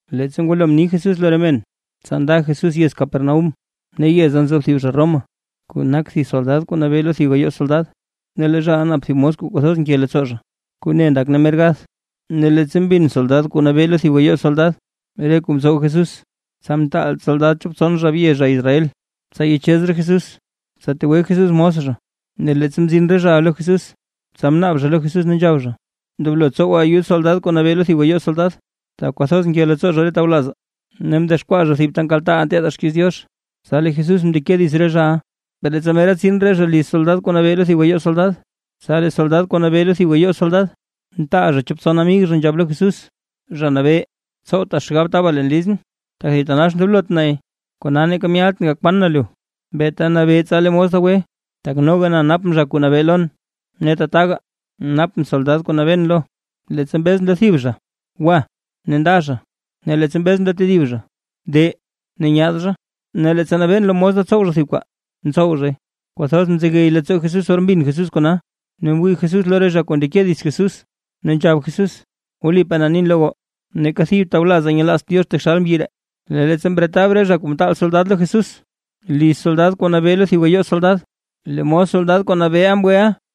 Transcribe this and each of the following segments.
Leettsa ngwalo mni Jesús lo re men, tsa nda Jesús yez Capernaúm. Ne yeza nzo thib zha Roma, kuu nak thib soldad kuu nabee lo thib gayoo soldad, ne lee zhaʼa nap thib mos kuu kwathoz nke leettsoo zha, kuu ne ndak ne mer gath. Ne leettsa mbin soldad kuu nabee lo thib gayoo soldad re kuu mtsow Jesús, tsa mtaal soldad chop tson zha bye zha Israel, tsa yachez zha Jesús, tsa tegwe Jesús mos zha. Ne leettsa mzin re zhaʼa lo Jesús, tsa mnaab zha lo Jesús ne nzhab zha: ―Ndoblo tsowa ayud soldad kuu nabee lo thib gayoo soldad, tak kwathoz nke leettsoo zha re tawlazaa, ne mdexkwaa zha thib ta nkaltaaʼaa nteedaa xkiiz Diox. Tsa lee Jesús mndeke dits re zhaʼa, per leettsa mera tsin re zha liz soldad kuu nabee lo thib gayoo soldad, tsa lee soldad kuu nabee lo thib gayoo soldad, mtaal zha chop tson amig zha nzhab lo Jesús: ―Zha Nabee, tsowta xgab taba leen lizʼn, tak thitanax ndoblot nay, kona neeka myaltʼn gakwaan na lu. Beeta nabee tsa lee mos da gwe. Tak noga na napʼn zha kuu nabee lon, ne tataga, napʼn soldad kuu nabeen lo. Leettsa mbezʼn lo thib zha: “Gwa” ne nda zha, ne leettsa mbezʼn lo tedib zha: “De”, ne nyaad zha, ne leettsa nabeen lo mos da tsow mos thib kwaa, ntsow zhay. Kwathoz mzegey leettsoo Jesús or mbin Jesús kona, ne mwii Jesús lo re zha kuu ndeke dits Jesús, ne nzhab Jesús: ―Wlipaa na nin lo goo, ¡neeka thib tawlazaa nyelaazt Diox taxal mbyi ree! Ne leettsa mretab re zha kuu mtaal soldad lo Jesús, liz soldad kuu nabee lo thib gayoo soldad, lee mos soldad kuu nabeeʼa mgweʼa.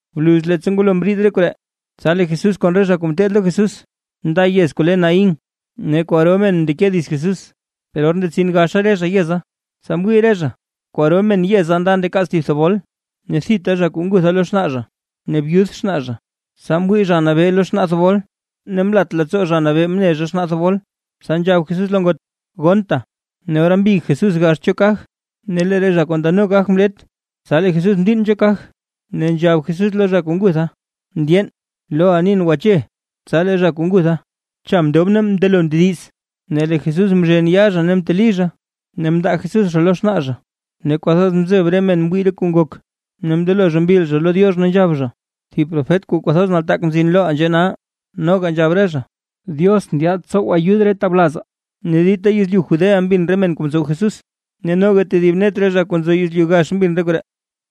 Bluz leettsa ngwalo mriid re koree, tsa lee Jesús kon re zha kuu ngeteed lo Jesús nda yez kuu le Naín. Ne kwaro men mndeke dits Jesús. Per or ndetsin gaxa re zha yeza, tsa mwii re zha, kwaro men yeza nda ndakaats thib thebol, ne thita zha kuu ngutha lo xnaa zha, ne byud xnaa zha. Tsa mwii Zha Nabee lo xnaa thebol, ne mlat leettsoo Zha Nabee mne xnaa thebol, tsa nzhab Jesús lo ngot: ―Gonnta. Ne ora mbig Jesús gax cho kaj, ne lee re zha kuu ndano kaj mlet, tsa lee Jesús mdiinn cho kaj, ne nzhab Jesús lo zha kuu ngutha: ―Mndyeen, loʼa nin: ¡Gwache! Tsa lee zha kuu ngutha, cha mndob ne mndelo mndediz, ne lee Jesús mzhen yaa zha ne mteli zha, ne mndaa Jesús zha lo xnaa zha. Ne kwathoz mzeb re men mwii re men kuu ngok, ne mndelo zha mbil zha lo Diox, ne nzhab zha: ―Thib profet kuu kwathoz nataak mzin loʼaa nzhee nal. Noga nzhab re zha: ―Diox ndyaad tsow ayud re tawlazaa. Ne dita yezlyu Judea mbin re men kuu mtsow Jesús, ne noga tedib net re zha kuu nzo yezlyu gax mbin re koree.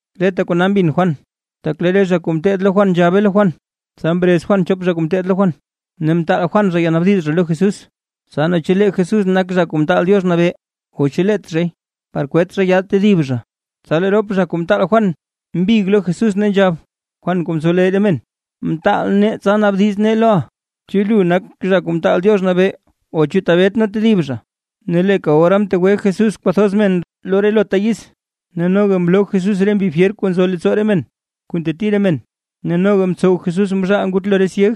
Reta kona mbin Juan, tak lee re zha kuu ngeteed lo Juan nzhabe lo Juan. Tsa mrez Juan chop zha kuu ngeteed lo Juan, ne mtaal Juan zha yanaabdiz zha lo Jesús, tsa naa chu lee Jesús nak Zha Kuu Mtaal Diox Nabee, o chu leet zhay, par kwet zha yaad tedib zha. Tsa lee rop zha kuu mtaal Juan mbig lo Jesús, ne nzhab: ―Juan kuu ntsowleyy re men, mtaal nee tsa naabdiz nee loʼa, “¿naa chu lu nak Zha Kuu Mtaal Diox Nabee o chu tebet nee tedib zha?” Ne leeka ora mtegwe Jesús kwathoz men lo relota yiz, noga mloo Jesús re mbi fyer kuu nzo leettsoo re men kuu nteti re men, ne noga mtsow Jesús mzhaal ngutlo re syeg.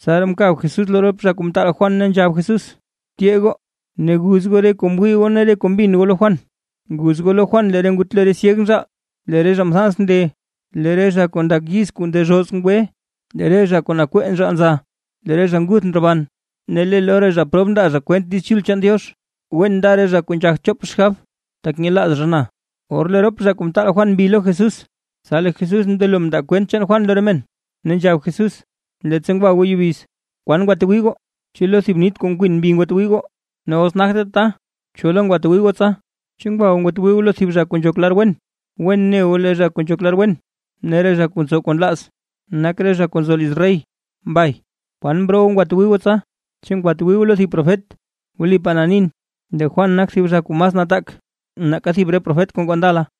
Tsaraa mkab Jesús lo rop zha kuu mtaal Juan, ne nzhab Jesús: ―Tyee goo ne guz goo re kuu mwii goo ne re kuu mbin goo lo Juan. Guz goo lo Juan lee ngutlo re syeg nzhaal, lee re zha mthans nde, lee re zha kuu ndak yiz kuu ndezhoz ngwe, lee re zha kuu nakwee nzhaal nza, lee zha nguth ndroban, ne lee lo re zha prob ndaa zha kwent Diiz Chul chaan Diox. ¡Wen nda re zha kuu nzhagt chop xgab, tak nyelaaz zha na! Or lee rop zha kuu mtaal Juan mbi lo Jesús, tsa lee Jesús mndelo mndaa kwent chaan Juan lo re men, ne nzhab Jesús: ―Leettsa ngwa goo yubiz, ¿kwan ngwatwii goo? ¿Chu lo thib nith kuu nkwin mbi ngwatwii goo? Ne os nagte tata, ¿cho lo ngwatwii goo tsa? ¿Chu ngwa goo ngwatwii goo lo thib zha kuu nzhok lar wen? Wen ne goo lee re zha kuu nzhok lar wen ne re zha kuu ntsow kuu nlaaz, nak re zha kuu nzo liz rey. Mbay, ¿kwan mroo goo ngwatwii goo tsa? ¿Chu ngwatwii goo lo thib profet? Wlipaa na nin, lee Juan nak thib zha kuu mas nataak nake thib re profet kuu ngoo ndala.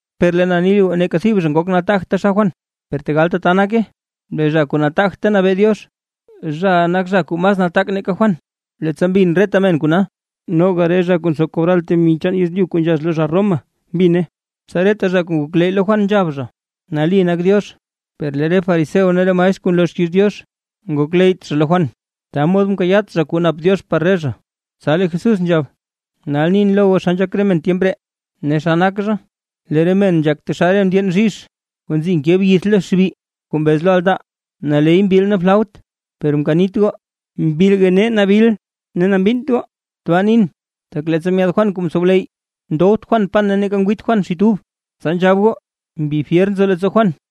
’Per lee na ni lo goo, neeka thib zha ngok nataagt taxal Juan. Per tegal tata nake lee zha kuu nataagt ta nabee Diox, zhaʼa nak zha kuu mas nataak nake Juan. Leettsa mbin reta men kona, noga re zha kuu ntsow kobral temi chaan yezlyu kuu nzhax lo zha Roma mbine, tsa reta zha kuu ngokleyy lo Juan, nzhab zha: “Nali nak Diox”. Per lee re fariseo ne re maestr kuu nloo xkiiz Diox, ngokleyyt zha lo Juan, ta mod mkayaat zha kuu nap Diox par re zha. Tsa lee Jesús nzhab: ―Nal nin lo goo naa xa nzhak re men tyemp ree ne xa nak zha. Lee re men nzhak taxal re ndyeen bzhizh, kuu nzi nke byith lo xbi, kuu mbez lo altaa: “Naley mbil nee flaut, per mkanit goo, mbilga nee nabil ne mbinnt goo”. Tbaa nin, tak leettsa myaad Juan kuu mtsowleyy, ndowt Juan pan neeka ngwiit Juan xit ub, tsa nzhab goo: “Mbi fyer nzo leettsoo Juan”.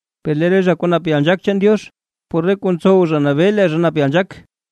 Per lee zha kuu nap yalnzhaak chaan Diox, por re kuu ntsow zha nabee lee zha nap yalnzhaak.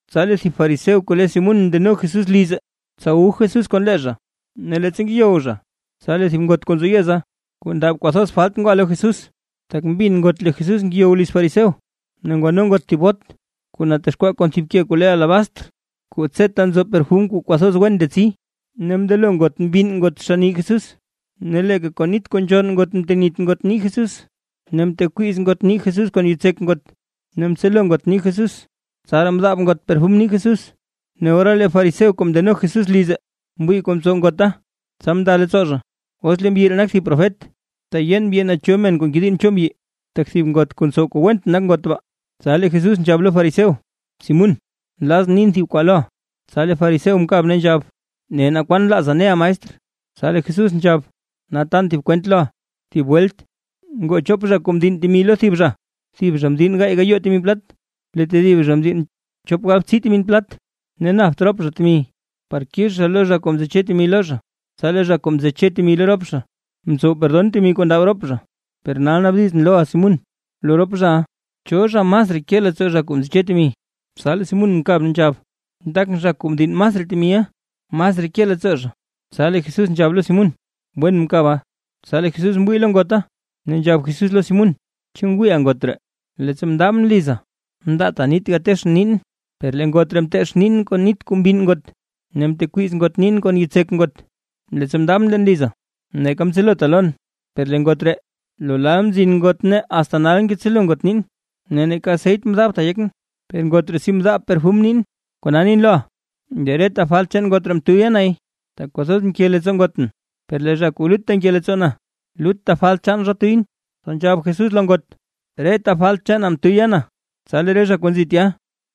Tsa lee thib fariseo kuu le Simún mndeno Jesús lize, tsa wu Jesús kon lee zha. Ne leettsa ngeyow zha, tsa lee thib ngot kuu nzo yeza, kuu ndab kwathoz falt ngwa lo Jesús, tak mbin ngot lee Jesús ngeyow liz fariseo, ne ngwano ngot thib bot kuu natexkwaa kon thib ke kuu le alabastr, kuu tseta nzo perfum kuu kwathoz wen ndetsi. Ne mndelo ngot mbinn ngot xann nii Jesús, ne leeka kon nit kuu nzhonn ngot mtenit ngot nii Jesús, ne mtekwiiz ngot nii Jesús kon yitsek ngot, ne mtselo ngot nii Jesús, tsaraa mdaab ngot perfum nii Jesús. Ne ora lee fariseo kuu mndeno Jesús lize, mwii kuu mtsow ngota, tsa mnda leettsoo zha: “Os lee mbyi ree nak thib profet, teyeen mbyi naa cho men kuu ngediinn cho mbyi, tak thib ngot kuu ntsow kuu went nak ngot baa”. Tsa lee Jesús nzhab lo fariseo: ―Simún, nlazʼn nin thib kwaa loʼa. Tsa lee fariseo mkab, ne nzhab: ―Ne, naa kwan nlaaza neʼa maestr. Tsa lee Jesús nzhab: ―Nal tan thib kwent loʼa. Thib welt ngoo chop zha kuu mdinn temi lo thib zha. Thib zha mdinn gaay gayoo temi plat; lee tedib zha mdinn chop galbtsii temi plat. Ne napt rop zha temi par kix zha lo zha kuu mtseche temi lo zha, tsa lee zha kuu mtseche temi lo rop zha, mtsow perdon temi kuu ndab rop zha. Per nal naabdizʼn loʼa Simún: Lo rop zhaʼa, ¿cho zha masraa ke leettsoo zha kuu mtseche temi? Tsa lee Simún mkab, ne nzhab: ―Ndakʼn zha kuu mdinn masraa temiʼa, masraa ke leettsoo zha. Tsa lee Jesús nzhab lo Simún: ―Wen mkaba. Tsa lee Jesús mwii lo ngota, ne nzhab Jesús lo Simún: ―¿Chu ngwiiʼa ngot ree? Leettsa mndaabʼn liza mndaata nit gateechʼn niin, per lee ngot ree mteech niin kon nit kuu mbinn ngot, ne mtekwiiz ngot niin kon yitsek ngot. Leettsa mndaabʼn leen liza, neeka mtselota lon, per lee ngot ree, lo lal mzin ngot ne asta nal ngetselo ngot niin. Ne neeka aseyt mdaabta yekʼn, per ngot ree si mdaab perfum nin. Kona nin loʼa, lee reta falt chaan ngot ree mtuyya nay, tak kwathoz mke leettsoo ngotʼn. Per lee zha kuu lutta nke leettsoo na, lutta falt chaan zha tuyʼn. Tsa nzhab Jesús lo ngot: ―Reta falt chaana mtuyya na. Tsa lee re zha kuu nzi tya,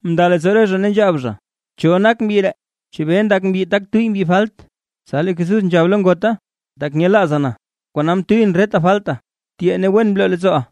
mnda leettsoo re zha ne nzhab zha: ―¿Cho nak mbyi ree? ¿Chebee ndak mbyi tak tuyy mbyi falt? Tsa lee Jesús nzhab lo ngota: ―Tak nyelaaza na, kona mtuyʼn reta falta, tyee ne wen bloo leettsooʼa.